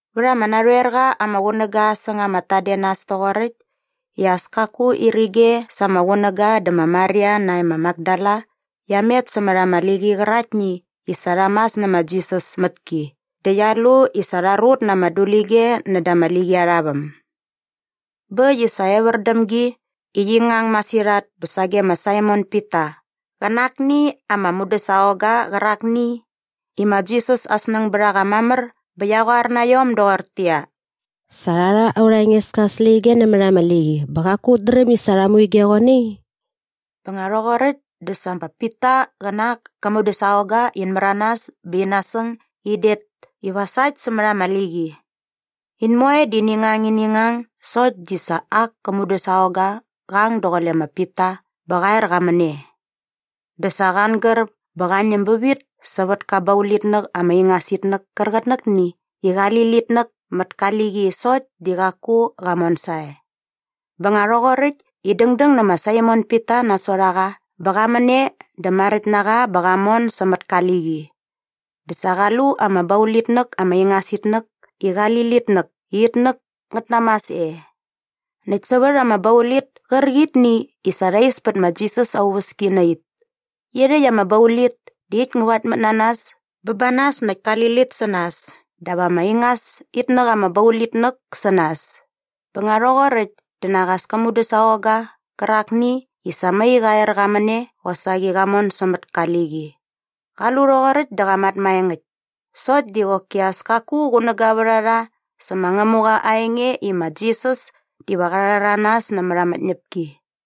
Vät ama narhoer qa ama qunäga säng ama tadenas toqoräkt i as kaku irige sa ama qunäga dä ma Maria nae ma Makdala qia met sämät ama liqi qäraktni i sa rha mas nä ma Jisas mät ki dä qia lu i sa rha rut na ama dulige näda ama liqi arha väm. Bä äkt i sa evär däm gi i qi ngang masirhat bä sage ma Saimon Pita qä na akni ama mudäsaqongga qärakni i ma Jisas aa snäng bät a qa mamär bä qia qoar na iom doqortäqyia, “Sa rha rha aurha Engeska aa släqyige nämät ama liqi bä qaku ut dräm i sa rha mu ige qoe nai!” Bä nga rhoqoräkt dä sa ma Pita qä na ak kä mudäsaqongga in märanas bä in nasäng i in det iva sa äkt sämät ama liqi. In moe di ini ngang ini ngang sokt di sa ak kä mudäsaqongga qa ang daqule ma Pita bä qa er qa män e. Dä sa qa angär bä qa ñäm bävit sävät ka baulitnäk ama ingas itnäk kärqitnäkni i qali litnäk mät ka liqi sokt di qaku qa mon sae. Bä nga rhoqoräkt i dängdäng nä ma Saimon Pita nasot a qa bä qa män e dä maräkt na qa bä qa mon sämät ka liqi. Dä sa qa lu ama baulitnäk ama ingas itnäk i qali litnäk i itnäk ngät namas e näkt sävät ama baulit kärqitni i sa rha is pät ma Jisas aa uväski na it. Irhäkt ama baulit di it ngä vaktmät na nas bä ba nas näkt kali lit sä nas dap ama ingas itnäk ama baulitnäk sä nas. Bä nga rhoqoräkt dä nak as kä mudäsaqongga qärakni i sa mai qa er qa män e qosaqi qa mon sämät ka liqi. Qa lu rhoqoräkt dä qa mat maengäkt. Sokt di qoki as kaku qunäga vät a rha sä ma Ngämuqa aa enge i ma Jisas diva qa rhäranas nämät ama tñäpki.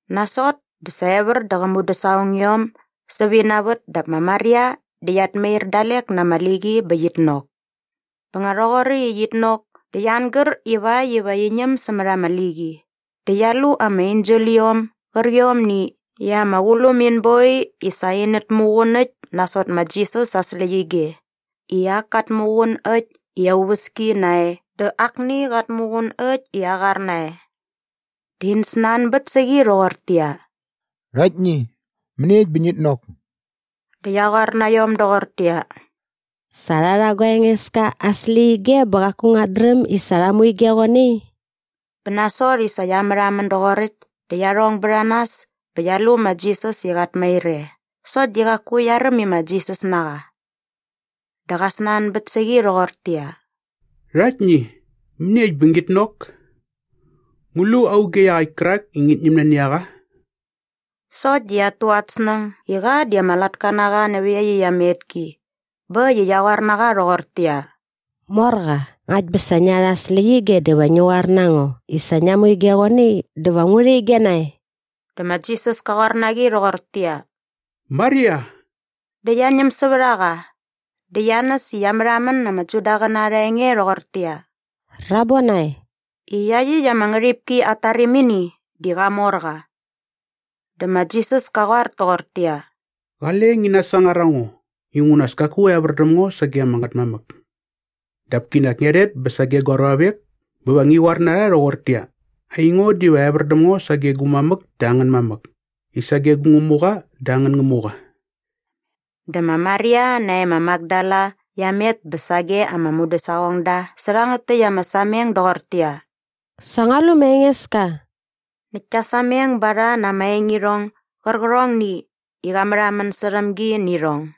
Nasot dä sa evär dä qä mudäsaqongiom sävä ina vät dap ma Maria di qiat mair dalek na ama liqi bä qit nok. Bä nga rhoqoräkt i qit nok dä qia angär ivakt iva qi ñäm sämät ama liqi dä qia lu ama enseliom gärqiomni i ama qulum in boi i sa inät muqun äkt nasot ma Jisas aa släqyige i ak kat muqun äkt i aa uväski nae dä akni qat muqun äkt i aa qar nae. Dä in snanbät sä qi rhoqortäqyia, “Rhaktni, mäniekt bä ngit nok?” Dä qia qoar na iom doqortäqyia, “Sa rha rha gua Engeska aa släqyige bä qaku nguat dräm i sa rha mu ige qoe nai.” Bä nasot i sa qia märhamän doqoräkt dä qia rhong bät a nas bä qia lu ma Jisas i qat mair e sokt di qaku qia räm i ma Jisas na qa. Dä qa snanbät sä qi rhoqortäqyia, “Rhaktni, mäniekt bä ngit nok? Ngu lu auge iaqäkt kärak i ngit ñäm nani a qa?” Sokt di qiat tu at snäng i qa di ama latka na qa nävät iaqyäkt ama etki bä äkt i qia qoar na qa rhoqortäqyia, “Morqa, ngakt bä sa ngia rha aa släqyige dä va ngi qoar na ngo i sa ngia mu ige qoe nai dä va ngu rha ige nae.” Dä ma Jisas ka qoar na qi rhoqortäqyia, “Maria.” Dä qia ñäm sävät a qa dä qia näs i qia märhamän na ama Judaqäna arha enge rhoqortäqyia, “Rabonai!” i iaqyäkt ama ngärhipki at tarimini di qamorqa. Dä ma Jisas ka qoar toqortäqyia, “Qale ngi nasangar a ngo inguna as kaku evär däm ngo sage ama Ngätmamäk. Dap kinak ngia rhet bä sage gua ruavek bä va ngi qoar na rha rhoqortäqyia, ‘Aingo diva evär däm ngo sage gu mamäk dä angän mamäk i sage gu Ngämuqa dä angän Ngämuqa.’” Dä ma Maria nae ma Makdala qia met bä sage ama mudäsaqongda sä rhangät täkt ama sameng doqortäqyia, “Sa ngua lu ma Engeska!” Näkt kia sameng ba rha na ama engirhong gärqärhongni i qa märhamän särhäm gi nä irhong.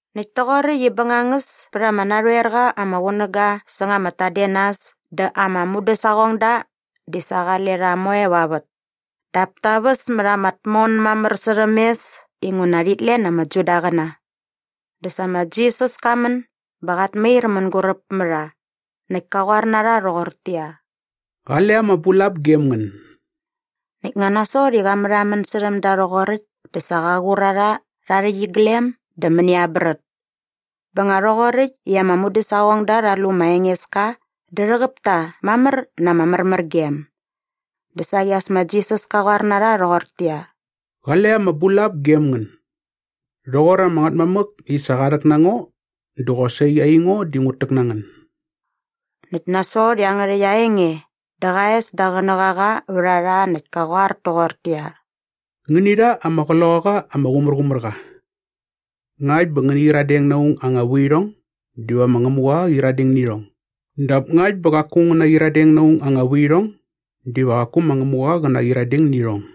Näkt toqoräkt i bängangäs pät ama narhoer qa ama qunäga säng ama tadenas dä ama mudäsaqongda di sa qale rha moe va vät. Dap ta väs mät ama tmon mamär särhäm mes inguna rhit len ama Judaqäna. Dä sa ma Jisas ka män bä qat mair mänguräp mä rha näkt ka qoar na rha rhoqortäqyia, “Qale ama bulap gem ngän.” Näkt ngä nasot i qa märhamän särhäm da rhoqoräkt dä sa qa qur a rha rha aa rhäqyiglem dä mäni aa brät. Bä nga rhoqoräkt i ama mudäsaqongda rha lu ma Engeska dä rhäqäp ta mamär na ama märmärgem. Dä saqi as ma Jisas ka qoar na rha rhoqortäqyia, “Qale ama bulap gem ngän. Rhoqor ama Ngätmamäk i sa qa rhäk na ngo dä qosaqi aingo di ngut täk na ngän.” Näkt nasot iangärhäkt aa enge dä qa es da aa qänäqaqa vät a rha näkt ka qoar toqortäqyia, “Ngäni rha ama Qloqaqa ama Qumärqumärqa. Ngakt bä ngäni qyiradeng na aung aa anga vuirhong diva ma Ngämuqa qä qyiradeng nä irhong dap ngakt bä qaku ngän naqyiradeng na aung aa anga vuirhong diva qaku ma Ngämuqa qä naqyiradeng nä irhong.”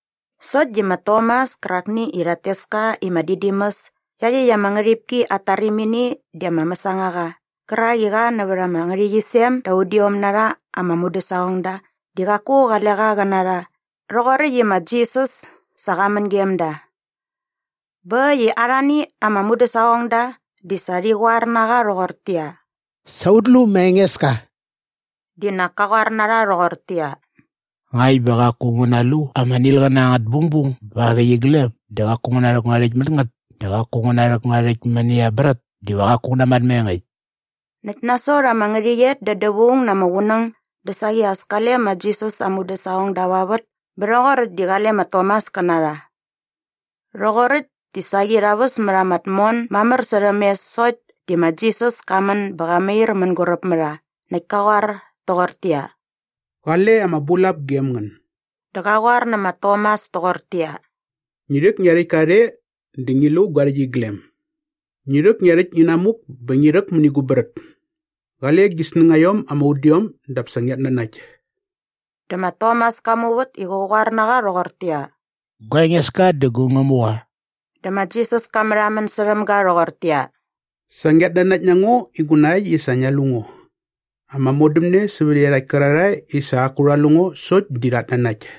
Sokt di ma Tomas kärakni i rhat tes ka i ma Didimus i iaqyäkt ama ngärhipki at tarimini di ama mäsangaqa qärak i qa nävät ama ngärhäqyisem da udiom na rha ama mudäsaqongda di qaku qale qa qä na rha rhoqoräkt i ma Jisas sa qa män gem da. Bä äkt i arhani ama mudäsaqongda di sa rhi qoar na qa rhoqortäqyia, “Sa ut lu ma Engeska!” Di nak ka qoar na rha rhoqortäqyia, “Ngakt bä qaku ngu nalu ama nilqäna angät bungbung ba aa rhäqyiglem dä qaku ngu narhäk ngua rhäktka mät ngät dä qaku ngu narhäk ngua rhäkt mäni aa brät diva qaku ngu namat maengäkt.” Näkt nasot ama ngärhäqyet da dävaung na ama qunäng dä saqi as kale ma Jisas aa mudäsaqongda va vät bä rhoqoräkt di qale ma Tomas kä na rha. Rhoqoräkt di saqi rha väs mät ama tmon mamär särhäm mes sokt di ma Jisas ka män bä qat mair mänguräp mä rha näkt ka qoar toqortäqyia, “Qale ama bulap gem ngän.” Dä qa qoar nä ma Tomas toqortäqyia, “Ngi rhäk ngia rhäktka rhe dä ngi lu gua rhäqyiglem. Ngi rhäk gia rhäkt inamuk bä ngi rhäk mäni gu brät. Qale gi snängaiom ama udiom dap sa ngiat nanakt.” Dä ma Tomas ka muvät i qä qoar na qa rhoqortäqyia, “Gua Engeska dä gu Ngämuqa!” Dä ma Jisas ka märhamän särhäm ga rhoqortäqyia, “Sa ngiat nanakt na ngo inguna äkt i sa ngia lu ngo. Ama modämne sävät iarhakt kärarhae i sa qaku rha lu ngo sokt di rhat nanakt.”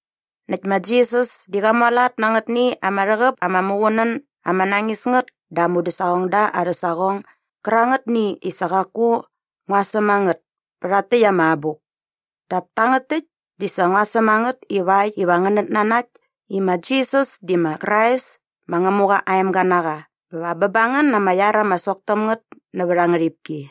Näkt ma Jisas di qa mualat na angätni ama rhäqäp ama muqunän ama nañis ngät da aa mudäsaqongda arhä saqong gärangätni i sa qaku ngua säm a ngät pä rhakt täkt ama abuk. Dap tangät täkt di sa ngua säm a ngät ivakt iva ngänät nanakt i ma Jisas di ma Krais ma Ngämuqa aa emga na qa bä va bä ba ngän na ama iar ama sok täm ngät nävät aa ngärhipki.